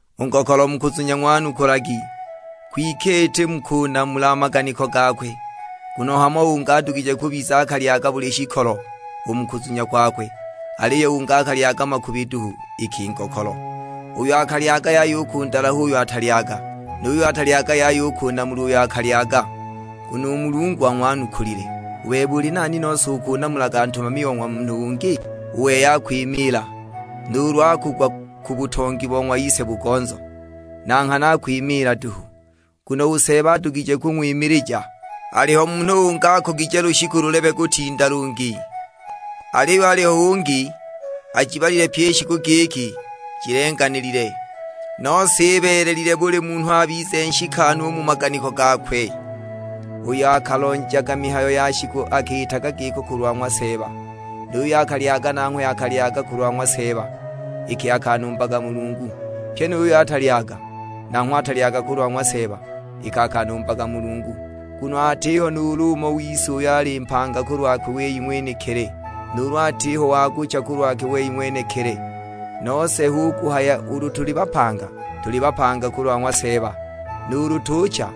U ngokolo mu kuzunya ng'wanukulagi, kwike iti mu kunamula a maganiko gakwe. Nguno hamo ungi adugije kubiza akalyaga buli shikolo u mu kuzunya kwakwe, aliyo ungi akalyaga makubi duhu iki ngokolo. Uyo akalyaga yaya u kundalaha uyo atalyaga, nu yuyo atalyaga yaya u kunamula uyo akalyaga, nguno u Mulungu ang'wanukulile. U bebe uli nani nose ukunamulaga ntumami o ng'wa munhu ungi? U wei akwimiila, nuulu akugwa ku butongi bo ng'wa ise-bugonzo; na nghana akwimiila duhu, nguno u Seeba adugije kung'wimilija. Aliho munhu ungi akugije lushiku lulebe kutinda lungi, aliyo aliho ungi ajibalile pyi i shiku giki jilenganilile; nose ibeelelile buli munhu abize nshikanu u mu maganiko gakwe. Uyo akalonjaga mihayo ya shiku akiitaga giko kulwa ng'wa Seeba, nu yuyo akalyaga nanghwe akalyaga kulwa ng'wa Seeba, iki akanumbaga Mulungu; pyi nu yuyo atalyaga, nanghwe atalyaga kulwa ng'wa Seeba iki akanumbaga Mulungu. Nguno atiho nuulu umo wise uyo ali mpanga kulwakwe wei ng'wenekili, nuulu atiho wa kucha kulwakwe wei ng'wenekili. Nose hu kuhaya ulu tuli bapanga, tuli bapanga kulwa ng'wa Seeba, nuulu tucha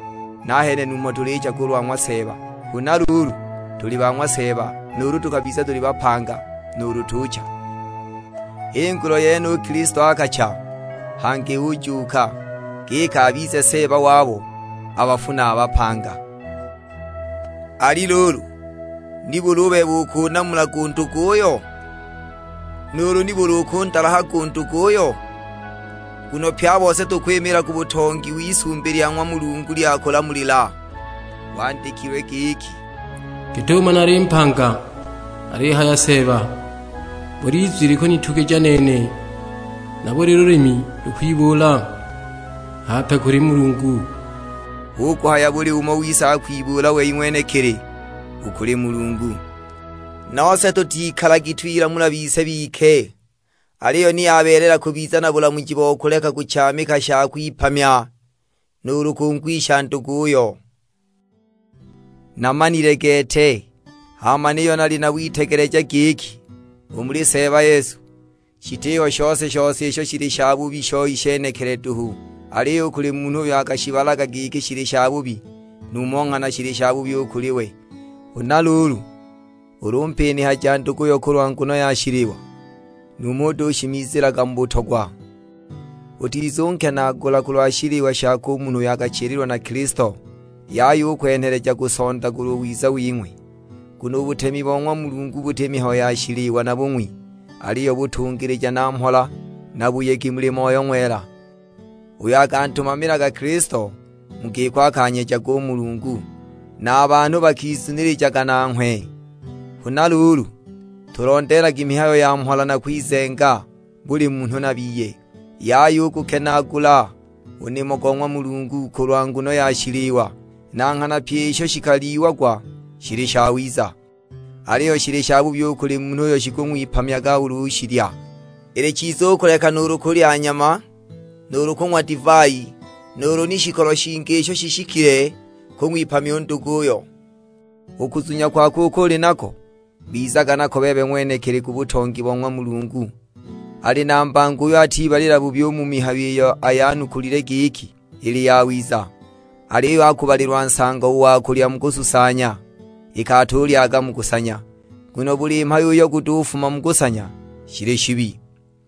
nahene numho tulicha kulwa ng'wa Seeba. Huna luulu, tuli ba ng'wa Seeba nuulu tukabiza tuli bapanga, nuulu tucha. H'i nguno yene u Kilisto akacha hangi ujuuka, giki abize Seeba wabo a bafu na a bapanga. Ali luulu nibuli u bebe ukunamulaga u nduguyo? Nuulu nibuli ukundalahaga u nduguyo? Nguno pye a bose tukwimiila ku butongi w'isumbi lya ng'wa Mulungu lya kulamulila. Gwandikilwe giki, " 'Git'umo nali mpanga;' alihaya Seeba, 'Buli izwi likunitugija nene, na buli lulimi lukwibuula hape kuli Mulungu.' " Hu kuhaya buli umo wise akwibuula wei ng'wenekili, u kuli Mulungu.'' Nose tutikalagi twilamula bise bike; aliyo ni yabeelela kubiza na bulamuji bo kuleka kuchaamika sha kung'wipamya nuulu kungwisha nduguyo. Namanile gete, hama niyo nali na witegeleja giki u muli Seeba Yesu, shitiho shose-shose isho shili shabubi shoi shenekili duhu. Aliyo u kuli munhu uyo akushibalaga giki shili shabubi, numho nghana shili shabubi u kuli we. Huna luulu ulu umpinihaja nduguyo kulwa nguno ya shiliwa, numho utushimizilaga u mu butongwa; utizunkenaagula kulwa shiliwa shako u munhu uyo akachililwa na Kilisto. Yaya u kuwenheleja kusondagulwa u wiza wing'we. Nguno u butemi bo ng'wa Mulungu buti mihayo ya shiliwa na bung'wi, aliyo butungilija na mhola na buyegi muli Moyo Ng'wela. Uyo akantumamilaga Kilisto mu giko akanyejaga u Mulungu, na a banhu bakizunilijaga nanghwe. Huna luulu, tulondeelagi mihayo ya mhola na kwizenga buli munhu na biye; yaya u kugukenaagula u nimo go ng'wa Mulungu kulwa nguno ya shiliwa. Na nghana pyi isho shikalyiagwa shili shawiza, aliyo shili shabubi u kuli munhu uyo shikung'wipamya ulu ushilya. Ili chiza u kuleka nuulu kulya nyama, nuulu kung'wa divai, nuulu ni shikolo shingi isho shishikile kung'wipamya nduguyo. U kuzunya kwako uko uli nako, bizaga nako bebe ng'wenekili ku butongi bo ng'wa Mulungu. Ali na mbango uyo atibalila bubi u mu mihayo iyo ayanukulile giki ili yawiza. Aliyo akubalilwa nsango u wa kulya mu kususanya, iki atulyaga mu kusanya; nguno buli mhayo uyo gutufuma mu kusanya shili shibi.